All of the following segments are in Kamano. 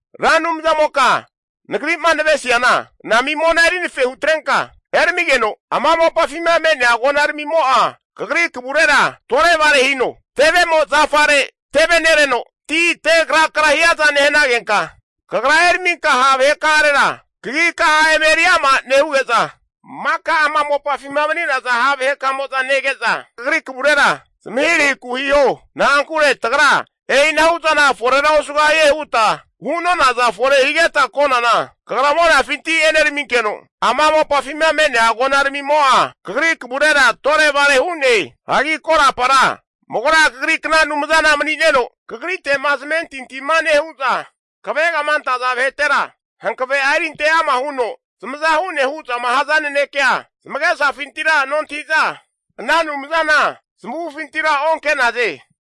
Ra Anumzamoka nagri'ma navesiana anami mona eri anafe hutrenka eramigeno, ama mopafima me'nea agonaramimo'a kagri kavurera tore'vare hino. Tevemo zafare tevenereno ti tegrakra hiaza nehanagenka, kagra eraminka ha' vaheka'arera kagika'a eme eri ama nehuge'za, maka ama mopafima mani'naza ha' vahekamo'za nege'za kagri kavurera zamahirahiku hiho. Na'ankure tagra e'inahu'zana forera osugahie huta hu'nonaza fore higeta konana, kagra monafinti eneraminkeno, ama mopafima me'nea agonaramimo'a kagri kavurera tore'vare hu'ne. Hagi korapara magora Kagri kna Anumzana mani'neno, kagrite'ma zamentintima nehu'za, kavegama antaza vahetera hankave'a erinte ama huno zamaza hu'ne hu'zama haza nanekea zamagesafintira nontahi'za, ana anumzana zamavufintira onke'naze.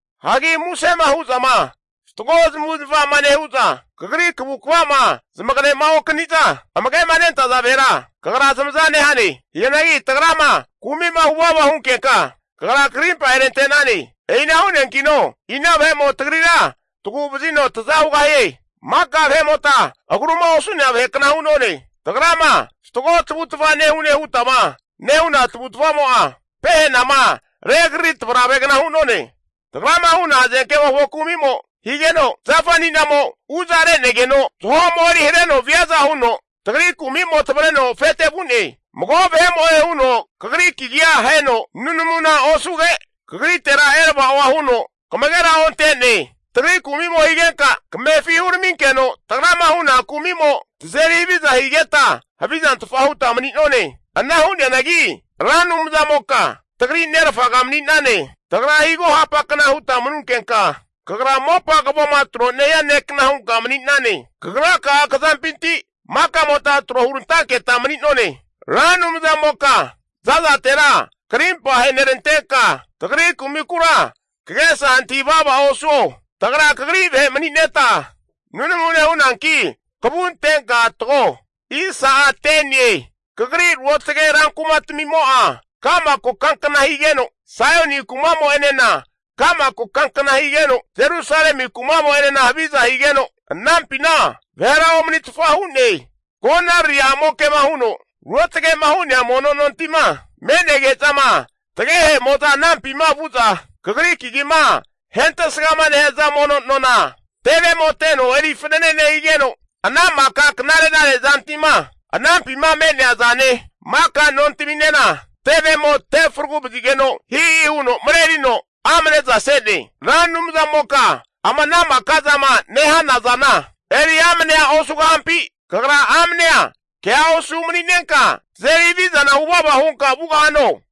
Hagi musema hu'zama fatgo zamavu'zamava nehu'za, kagri kavukava'ma zamagema okaniza amage'ma nentaza vahera kagra zamaza nehane. Hianagi tagrama kumi'ma huvava hunkenka, kagra karimpa aherantenane. E'ina hu'neankino ina vahe'mo tagrira taguvazino taza hugahie? Maka vahe'mota agruma osu'nea vahekna hunone. Tagrama fatgo tavutava nehune hutama nehu'na tavutavamo'a, pehanama regriri tavravegna hu'none. Tagrama hu'na hazenkemofo kumi'mo higeno, zafa ani'namo uza re'negeno zaho'mo eri hareno viaza huno tagri kumi'mo tavareno afete vu'ne. Mago vahe'mo'e huno kagri kagia aheno nunamuna osuge, kagritera erava'oa huno kamagera onte'ne. Tagri kumi'mo higenka kamefi huraminkeno, tagrama huna kumi'mo tazeri haviza higeta havizantfa huta mani'none. Ana hu'neanagi Ra Anumzamoka tagri nerfaga mani'nane. Tagra higo mopagna huta manunkenka, kagra mopa kavoma tro nehia nekna hunka mani'nane. Kagraka'a kazampinti makamota tro hurantanketa mani'none. Ra Anumzamoka zazatera krimpa ahenerantenka, tagri kumikura kagesa antahi vava osuo. Tagra kagri vahe mani'neta nunamu nehunanki kavua antenka tago. Kagri routage rankumatamimo'a ka'ma kokankna higeno, Saioni kumamo'enena ka'ma kokankna higeno, Jerusalemi kumamo'enena haviza higeno anampina vahera omanitfa hu'ne. Konariri amoke'ma huno ruotage'ma hu'nea mono nontima, me'nege'zama tagehe'moza anampima vu'za Kagri kagima ahentesgama nehaza mono nona, tevemo teno eri fanane nehigeno, ana maka knare narezanti'ma anampima me'nea zane, maka nontaminena tevemo te fragu vazigeno hihi huno marerino amne'za se'ne. Ra Anumzamoka ama ana maka zama nehanazana, eri amnea osugahampi? Kagra amanea kea osu mani'nenka tazeri havizana huvava hunka vugahano?